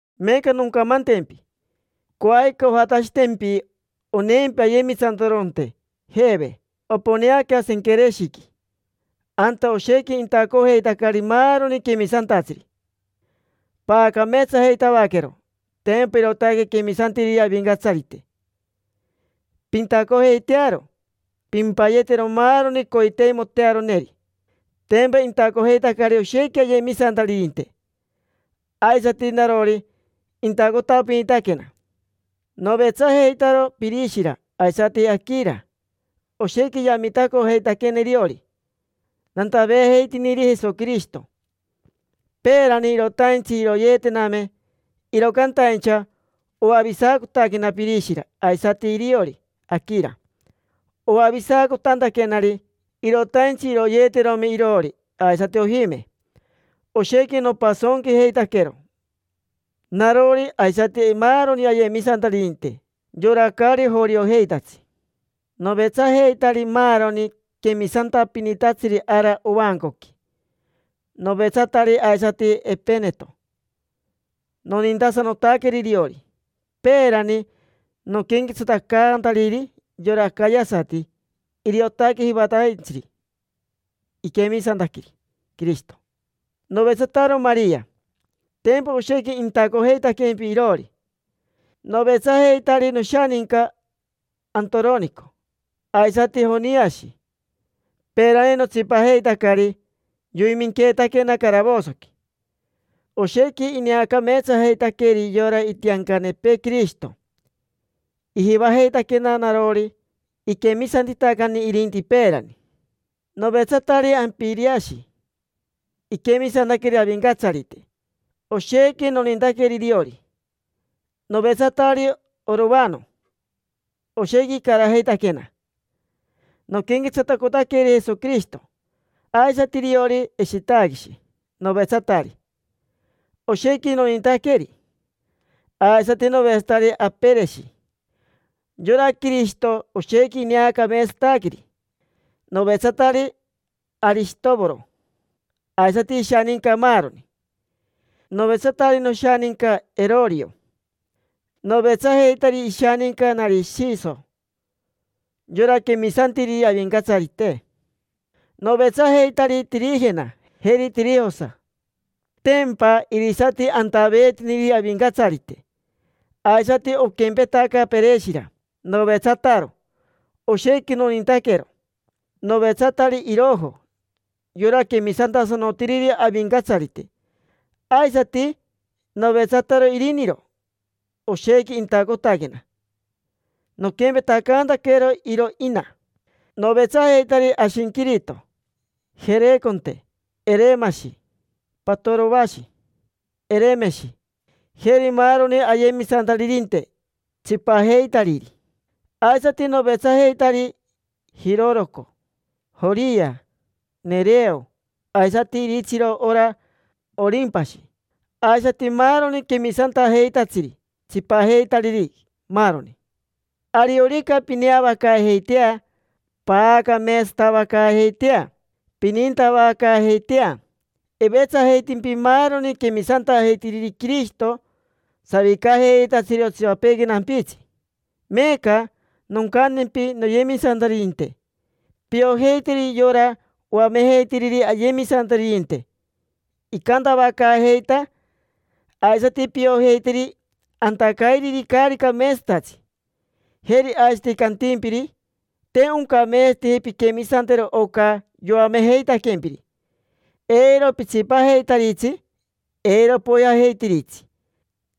Meeca noncamantempi: coajica ojatashitempi oneempi ayemisantaroronte Jeve. Oponeaca Senquereshiqui, anta oshequi intacojeitacari maaroni quemisantatsiri. Paacameetsajeitavaquero, tempa irootaque quemisantiriri Avincatsarite. Pintacojeitearo, pimpayetero maaroni coiteimotearoneri. Tempa intacojeitacari oshequi ayemisantaririnte; aisati narori, intacotapinitaquena. Novetsajeitaro Pirishira aisati Aquira. Oshequi yamitacojeitaquena iriori nantaveejeitiniri Jesoquirishito. Peerani irotaintsi iroyeetename, iro cantaincha oavisacotaquena Pirishira aisati iriori Aquira. Oavisacotantaquenari, irotaintsi iroyeeterome iroori, aisati ojime. Oshequi nopasonquijeitaquero: narori aisati maaroni ayemisantaririnte, yora caari joriojeitatsi. Novetsajeitari maaroni quemisantapinitatsiri ara ovancoqui. Novetsatari aisati Epeneto, nonintasanotaqueri iriori. Peerani noquenquetsatacantariri yora acayasati, iriotaque jivataintsiri iquemisantaqueri Quirishito. Novetsataro Maria, tempa oshequi intacojeitaquempi iroori. Novetsajeitari noshaninca Antoronico aisati Joniashi. Peerani notsipajeitacari yoiminqueetaquena caravosoqui. Oshequi ineacameetsajeitaqueri yora itiancanepee Quirishito. Ijivajeitaquena narori, iquemisantitacani irinti peerani. Novetsatari Ampiriashi, iquemisantaqueri Avincatsarite, oshequi nonintaqueri iriori. Novetsatari Orovano, oshequi icarajeitaquena noquenquetsatacotaqueri Jesoquirishito. Aisati iriori Eshitaquishi, novetsatari; oshequi nonintaqueri. Aisati novetsatari Apereshi; yora Quirishito, oshequi ineacameetsataqueri. Novetsatari Arishitovoro, aisati ishaninca, maaroni. Novetsatari noshaninca Erorio. Novetsajeitari ishaninca Narishiso, yora quemisantiriri Avincatsarite. Novetsajeitari Tirijena, jeri Tirijosa, tempa irisati antaveetiniriri Avincatsarite. Aisati oquempetaca Pereshira, novetsataro. Oshequi nonintaquero. Novetsatari Irojo, yora quemisantasanotiriri Avincatsarite. Aisati novetsataro iriniro, oshequi intacotaquena noquempetacaantaquero iro ina. Novetsajeitari Ashinquirito, Jereconte, Eremashi, Patorovashi, Eremeshi, jeri maaroni ayemisantaririnte tsipajeitariri. Aisati novetsajeitari Jiroroco, Joria, Nereo, aisati iritsiro, ora Orimpashi, aisati maaroni quemisantajeitatsiri tsipajeitariri, maaroni. Ariorica pineavacaajeitea, paacameetsatavacaajeitea, pinintavacaajeitea. Ivetsajeitimpi maaroni quemisantajeitiriri Quirishito savicajeitatsiri otsipapeequi nampitsi. Meeca noncantempi, noyemisantaririnte: piojeiteri yora oamejeitiriri ayemisantaririnte icantavacaajeita, aisati piojeiteri antacairiri caari cameetsatatsi, jeri aisati cantimpiri: “Te oncameetsateji pinquemisantero oca yoamejeitaquempiri”. Eiro pitsipajeitaritsi, eiro poijajeitiritsi.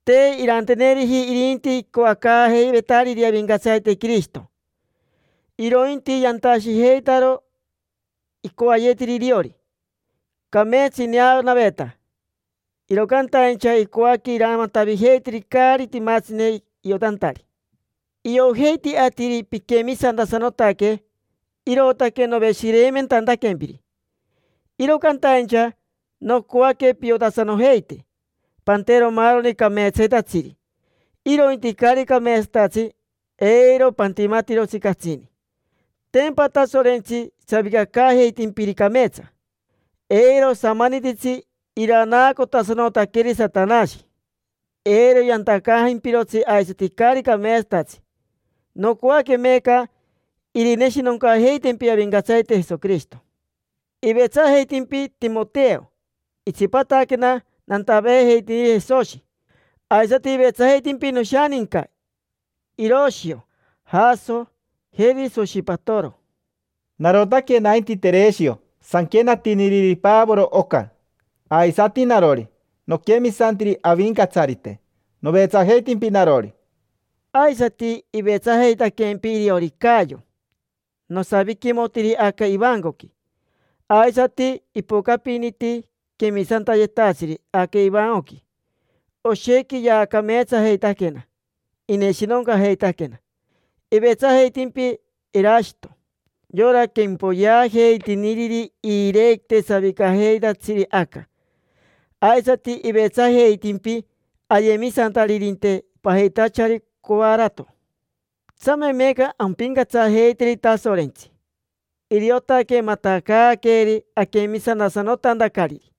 Te iranteneriji irinti icoacaajeivetariri Avincatsarite Quirishito, irointi yantashijeitaro icoayetiri iriori. Cameetsa ineanaveta, iro cantaincha icoaque iramatavijeiteri caari timatsine iotantari. Iojeiti atiri piquemisantasanotaque, irootaque noveshireimentantaquempiri. Iro cantaincha nocoaque piotasanojeite pantero maaroni cameetsayetatsiri; irointi caari cameetsatatsi, eiro pantimatirotsi catsini. Tempa Tasorentsi savicacaajeitimpiri cameetsa. Eiro osamanititsi iranaacotasanotaqueri Satanashi eiro yantacantajimpirotsi aisati caari cameetsatatsi. Nocoaque meeca irineshinoncaajeitempi Avincatsarite Jesoquirishito. Ivetsajeitimpi Timoteo; itsipataquena nantaveejeitiniri Jesoshi. Aisati ivetsajeitimpi noshaninca Iroshio, Jaso, jeri Soshipatere. Narotaque nainti Tereshio sanquenatiniriri Pavoro oca. Aisati narori, noquemisantiri Avincatsarite. Novetsajeitimpi narori. Aisati ivetsajeitaquempi iriori Cayo. Nosaviquimotiri aca ivancoqui. Aisati ipocapiniti quemisantayetatsiri aca ivancoqui, oshequi yaacameetsajeitaquena, ineshinoncajeitaquena. Ivetsajeitimpi Erashito, yora quempoyeajeitiniriri iirequite savicajeitatsiri aca. Aisati ivetsajeitimpi ayemisantaririnte pajitachari Coarato. Tsame meeca ampincatsajeiteri Tasorentsi. Iriotaque matacaaqueeri aquemisantasanotantacariri,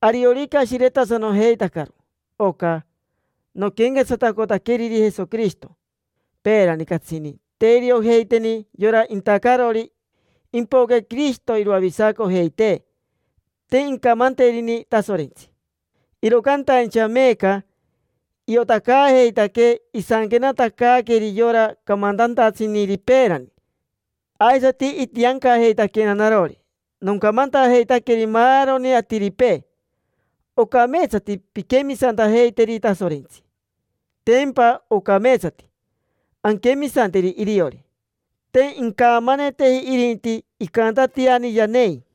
ariorica ashiretasanojeitacaro oca noquenquetsatacotaqueriri Jesoquirishito. Peerani catsini te iriojeiteni yora intacarori impoque Quirishito iroavisacojeitee. Te incamanterini Tasorentsi, iro cantaincha meeca iotacaajeitaquee. Isanquenatacaaqueri yora camantantatsiniri peerani, aisati itiancajeitaquena narori nocamantajeitaqueri maaroni atiripee: “Ocameetsati pinquemisantajeiteri Tasorentsi”. Tempa ocameetsati anquemisanteri iriori, te incamaneteji irinti, icantatiani yanei.